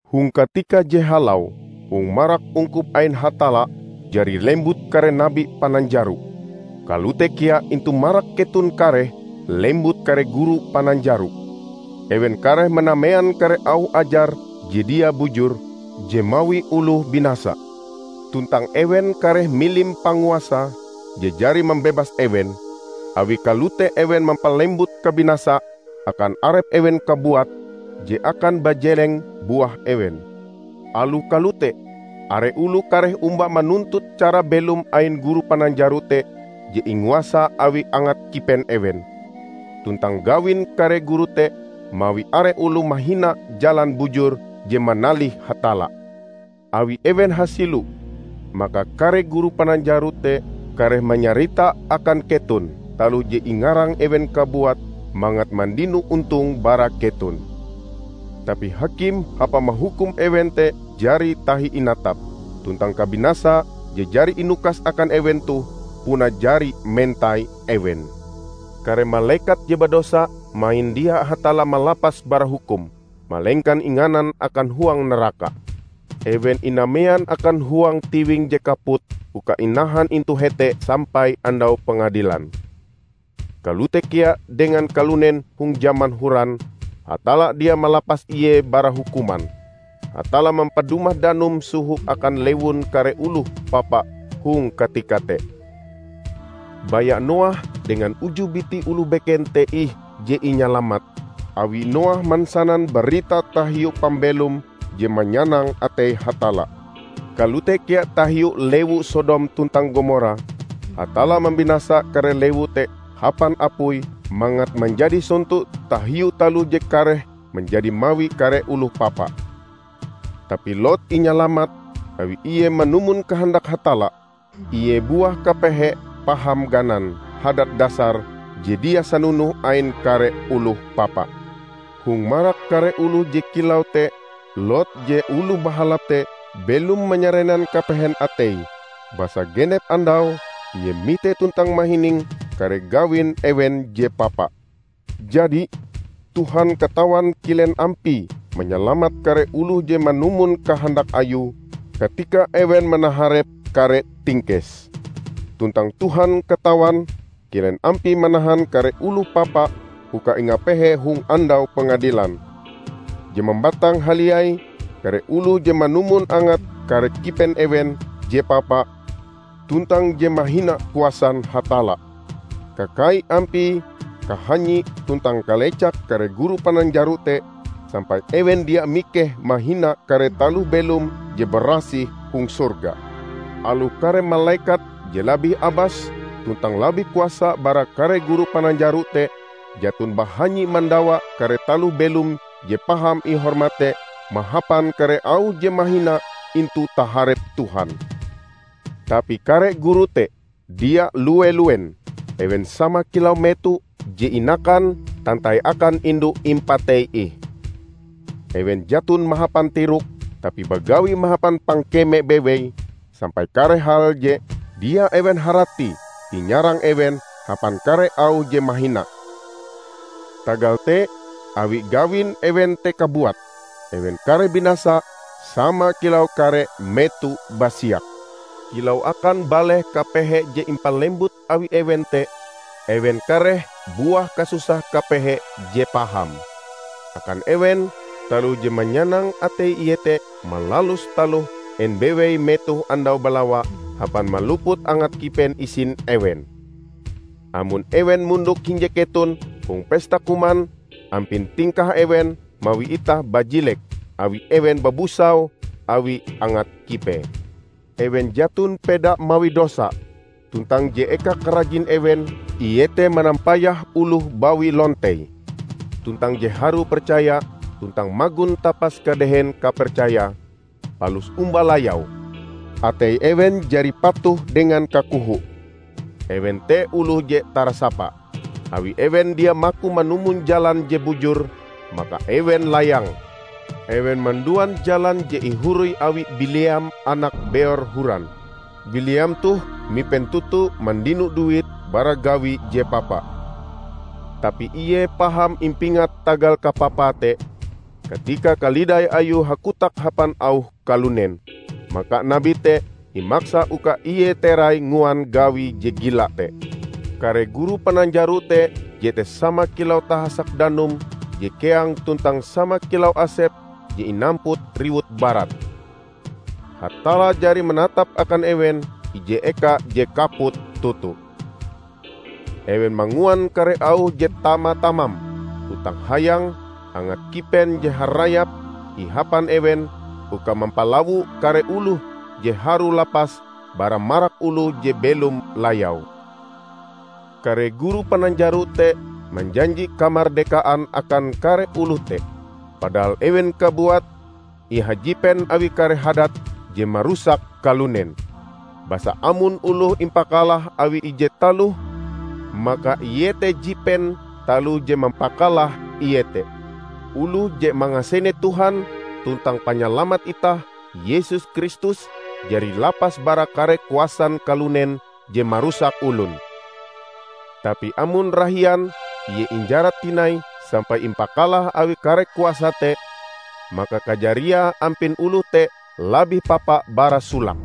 Hong katika je halau hong marak ungkup ain Hatalla jari lembut kare nabi pananjaro. Kalote kea intu marak keton kareh lembut kare guru pananjaro. Ewen kareh manamean kare auh ajar je dia bujur, je mawi oloh binasa. Tuntang ewen kareh milim Panguasa je jari mambebas ewen. Awi kalote ewen mampalembut kabinasa akan arep ewen kabuat, je akan bajeleng buah ewen. Aloh kalote, are oloh kareh omba manuntut cara belom ain guru pananjaro te je inguasa awi angat kipen ewen. Tuntang gawin kare guru te mawi are oloh mahina Jalan Bujur je manalih Hatalla. Awi ewen hasilo, maka kare guru pananjaro te kareh manyarita akan keton taloh je ingarang ewen kabuat mangat mandino ontong bara keton. Tapi hakim hapa mahukum ewen te jari tahi inatap, tuntang kabinasa je jari inukas akan ewen toh puna jari mentai ewen. Kare malekat je badosa mahin dia Hatalla malapas bara hukum, malengkan inganan akan huang naraka. Ewen inamean akan huang tiwing je kaput uka inahan intu hete sampai Andau Pengadilan. Kalote kea dengan kalunen hong jaman horan, Hatalla dia malapas ie bara hukuman. Hatalla mampadumah danum soho akan lewun kare oloh papa hong katika te. Baya Noah dengan uju biti oloh beken te ih je inyalamat, awi Noah mansanan barita tahiu pambelom je manyanang atei Hatalla. Kalote kea tahiu lewu Sodom tuntang Gomora: Hatalla mambinasa kare lewu te hapan apui mangat manjadi sonto tahiu taloh je kareh manjadi mawi kare oloh papa. Tapi Lot inyalamat, awi ie manumon kahandak Hatalla; ie buah kapehe paham ganan hadat dasar je dia sanonoh ain kare oloh papa. Hong marak kare oloh je kilau te Lot je oloh bahalap te belom manyarenan kapehen atei, basa genep andau ie mite tuntang mahining kare gawin ewen je papa. Jadi, Tuhan katawan kilen ampie manyalamat kare oloh je manumon kahandak Ayue katika ewen manaharep kare tingkes. Tuntang Tuhan katawan kilen ampie manahan kare oloh papa uka ingapehe hong Andau Pengadilan, je mambatang haliai kare oloh je manumon angat kare kipen ewen je papa tuntang je mahina kuasan Hatalla. Kakai ampie kahanyi tuntang kalecak kare guru pananjaro te sampai ewen dia mikeh mahina kare taloh belom je barasih hong sorga! Aloh kare malekat je labih abas tuntang labih kuasa bara kare guru pananjaro te, jaton bahanyi mandawa kare taloh belom je paham ihormat te mahapan kare auh je mahina intu taharep Tuhan. Tapi kare guru te, dia lue-luen! Ewen sama kilau meto je inakan tantai akan indu impatei ih. Ewen jaton mahapan tirok, tapi bagawi mahapan pangkeme bewei, sampai kare hal je dia ewen haratie inyarang ewen hapan kare auh je mahina. Tagal te awi gawin ewen te kabuat, ewen kareh binasa sama kilau kare meto basiak. Kilau akan baleh kapehe je impalembut awi ewen te, ewen kareh buah kasusah kapehe je paham. Akan ewen, taloh je manyanang atei iete malalus taloh en bewei metoh andau balawa hapan maluput angat kipen isin ewen. Amon ewen mondok hinje keton hong pesta kuman, ampin tingkah ewen mawi itah bajilek awi ewen babusau awi angat kipee. Ewen jaton peda mawi dosa, tuntang je eka karajin ewen iete manampayah oloh bawi lontei. Tuntang je harue percaya tuntang magon tapas kadehen kapercayae, palus omba layau. Atei ewen jari patuh dengan kakoho. Ewen te oloh je tarasapa! Awi ewen dia maku manumon jalan je bujur, maka ewen layang. Ewen manduan jalan je ihoroi awi Bileam anak Beor horan. Bileam toh mipen toto mandino duit bara gawie je papa. Tapi ie paham impingat tagal kapapae te, katika kalidai ayue hakotak hapan auh kalunen. Maka nabi te imaksa uka ie terai nguan gawie je gila te. Kare guru pananjaro te jete sama kilau tahasak danum je keang tuntang sama kilau asep je inamput riwut barat. Hatalla jari manatap akan ewen ije eka je kaput toto. Ewen manguan kare auh je tama-tamam tuntang hayang; angat kipen je harayap ihapan ewen uka mampalawo kare oloh je harue lapas bara marak oloh je belom layau. Kare guru pananjaro te manjanji kamardekaan akan kare oloh te, padahal ewen kabuat ihajipen awi kare hadat je marusak kalunen. Basa amon oloh impakalah awi ije taloh, maka ie te jipen taloh je mampakalah ie te. Oloh je mangasene Tuhan tuntang Panyalamat itah Yesus Kristus jari lapas bara kare kuasan kalunen je marusak olon. Tapi amon rahian ie injarat tinai sampai impakalah awi kare kuasa te, maka kajariae ampin oloh te labih papa bara solake.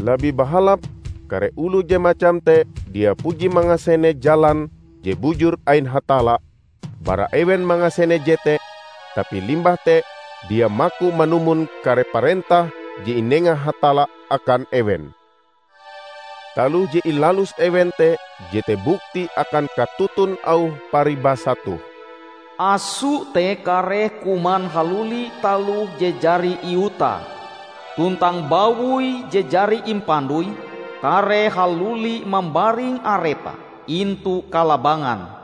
Labih bahalap kare oloh je macam te dia puji mangasene jalan je bujur ain Hatalla, bara ewen mangasene jete, tapi limbah te dia maku manumon kare parentah je inenga Hatalla akan ewen. Taloh je ilalus ewen te jete bukti akan katoton auh paribasa toh, "Aso te kareh kuman haluli taloh je jari iutae," tuntang "Bawoi je jari impandoi, kareh haluli mambaring arepe intu kalabangan."